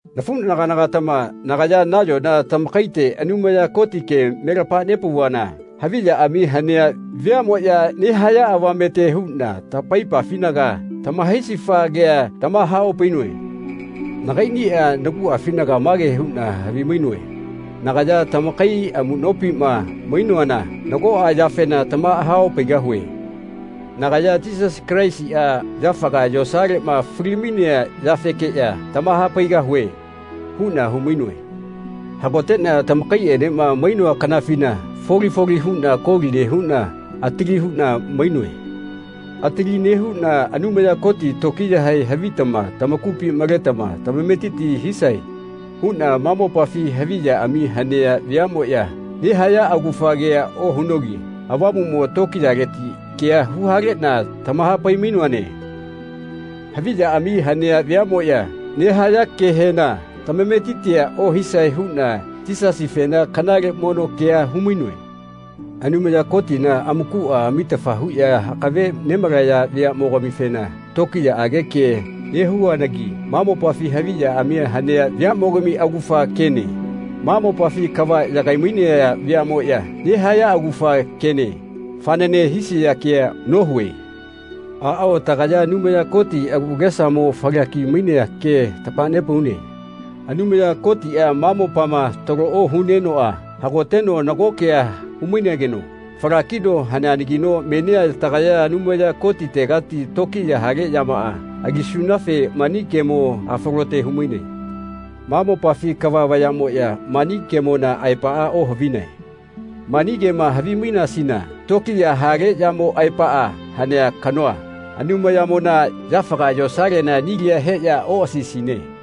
Nafuꞌnagana-gatama nagaya nayona tamakaite Anumaya Koti kema me lamahapauvana haviꞌyaꞌami hanea veaꞌmoꞌya nehaya avamete huꞌna tamaipafinaga tamahaisifa kea tamahaopainoe. Nagaiꞌnia naguꞌafinaga mage huꞌna havimainoe “Nagaya tamakai amuꞌnopima mainoana nagoꞌa yafena tamahaopaigahue. Nagaya Yisasi Kalaisiꞌa yafaga yosaleꞌma falimainea yafekeꞌya tamahapaigahue.” huꞌna humainoe. Hagoteꞌna tamakaiꞌenema mainoa kanafina foli foli huꞌna koli nehuꞌna atali huꞌna mainoe. Atali nehuꞌna Anumaya Koti tokiyahe havitama tamakupi maletama tamametiti hisae huꞌna ma mopafi haviꞌyaꞌami hanea veaꞌmoꞌya nehaya augafa kea ohunogi Avamuꞌmo tokiyaleti kea huhaleꞌna tamahapai-mainoane. Haviꞌyaꞌami hanea veaꞌmoꞌya nehaya kehena tamametitia ohisae huꞌna Yisasifena kanale mono kea humainoe. Anumaya Kotina amakuꞌa amitafa huꞌya akave nemalaya veaꞌmogamifena tokiyaꞌage kea nehuanagi ma mopafi haviꞌyaꞌami hanea veaꞌmogami augafa kene, ma mopafi kava yagai-mainaya veaꞌmoꞌya nehaya augafa kene, fanane hisia kea nohue. Aꞌao, tagaya Anumaya Koti agu agesamoꞌa falaki-mainea ke tamahanepaune. Anumaya Kotiꞌa ma mopama talo ohunenoꞌa hagoteno nago kea humainegeno falakino haneanagino menia lagaya Anumaya Kotitegati tokiya hale yamaꞌa alisunafe mani kemoꞌa falote humainone. Ma mopafi kava vayaꞌmoꞌya mani kemona aepaꞌa ohavinae. Mani kema havimainasina tokiya hale yamo aepaꞌa hanea kanoa, Anumayamona, yafaga yosalela nilia heꞌya oꞌasaisine.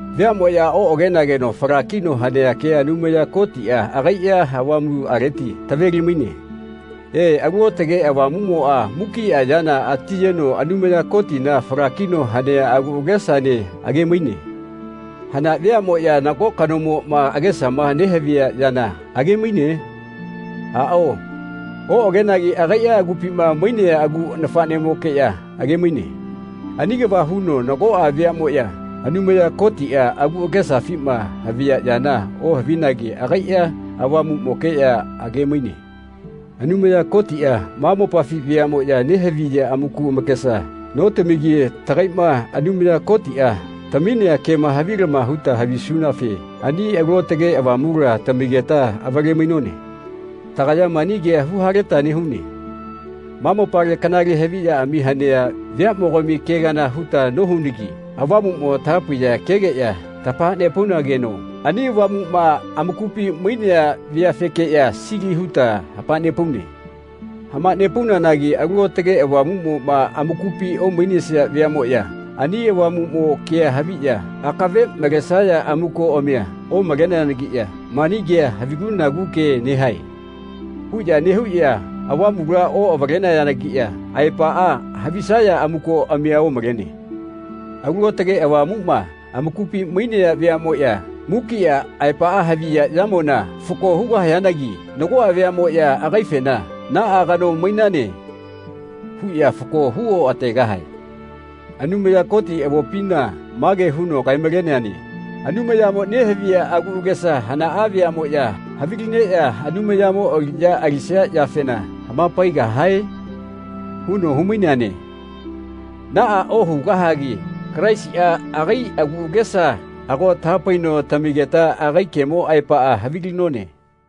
Veaꞌmoꞌya oꞌagageno falakino hanea kea Anumaya Kotiꞌa agaiꞌa Avamuꞌaleti taveli-maine. E, Alu Aotage Avamuꞌmoꞌa mukiꞌa yana atiyeno Anumaya Kotina falakino hanea agu agesaene agemaine. Hana veaꞌmoꞌya nago kanomoꞌma agesama nehavia yana agemaine? Aꞌao oꞌagenagi agaiꞌa agupima mainea agu nafaꞌmokeꞌya agemaine. Ani kava huno nagoꞌa veaꞌmoꞌya Anumaya Kotiꞌa agu agesafima havia yana ohavinagi agaiꞌa Avamuꞌmokeꞌya agemaine. Anumaya Kotiꞌa ma mopafi veaꞌmoꞌya nehaviya amaku amakesa notamigi tagaiꞌma Anumaya Kotiꞌa taminea kema havilama huta havisunafe ani Alu Aotage Avamula tamigeta avale-mainone. Tagaya mani kea huhaleta nehune. Ma mopale kanale haviꞌyaꞌami hanea veaꞌmogami ke kana huta nohunagi Avamuꞌmo tahapaiya kegeꞌya tamahanepaunageno ani Avamuꞌma amakupi mainea veafekeꞌya sili huta hamanepaune. Hamanepaunanagi Alu aotage Avamuꞌmoꞌma amakupi omainesia veaꞌmoꞌya ani Avamuꞌmo kea haviꞌya akave malesaya amukoꞌamia omaleneanagiꞌya “Mani kea havigu-nagu ke nehae.” huꞌya nehuꞌya Avamula oꞌavalenayanagiꞌya aepaꞌa havisaya amukoꞌamia omalene. Alu Aotage Avamuꞌma amakupi mainea veaꞌmoꞌya mukiꞌa aepaꞌa haviya yamona fako hugahayanagi nagoꞌa veaꞌmoꞌya agaifena “Naꞌa kano mainane.” huꞌya fako hu oꞌategahae. Anumaya Koti avopina mage huno kae-maleneane “Anumayamo nehavia agu agesa hanaꞌa veaꞌmoꞌya havilineꞌya Anumayamo aliꞌya alisia yafena hapaigahae?” huno humaineane. Naꞌa ohugahagi Kalaisiꞌa agai agu agesa ago tahapaino tamigeta agai kemo aepaꞌa havilinone.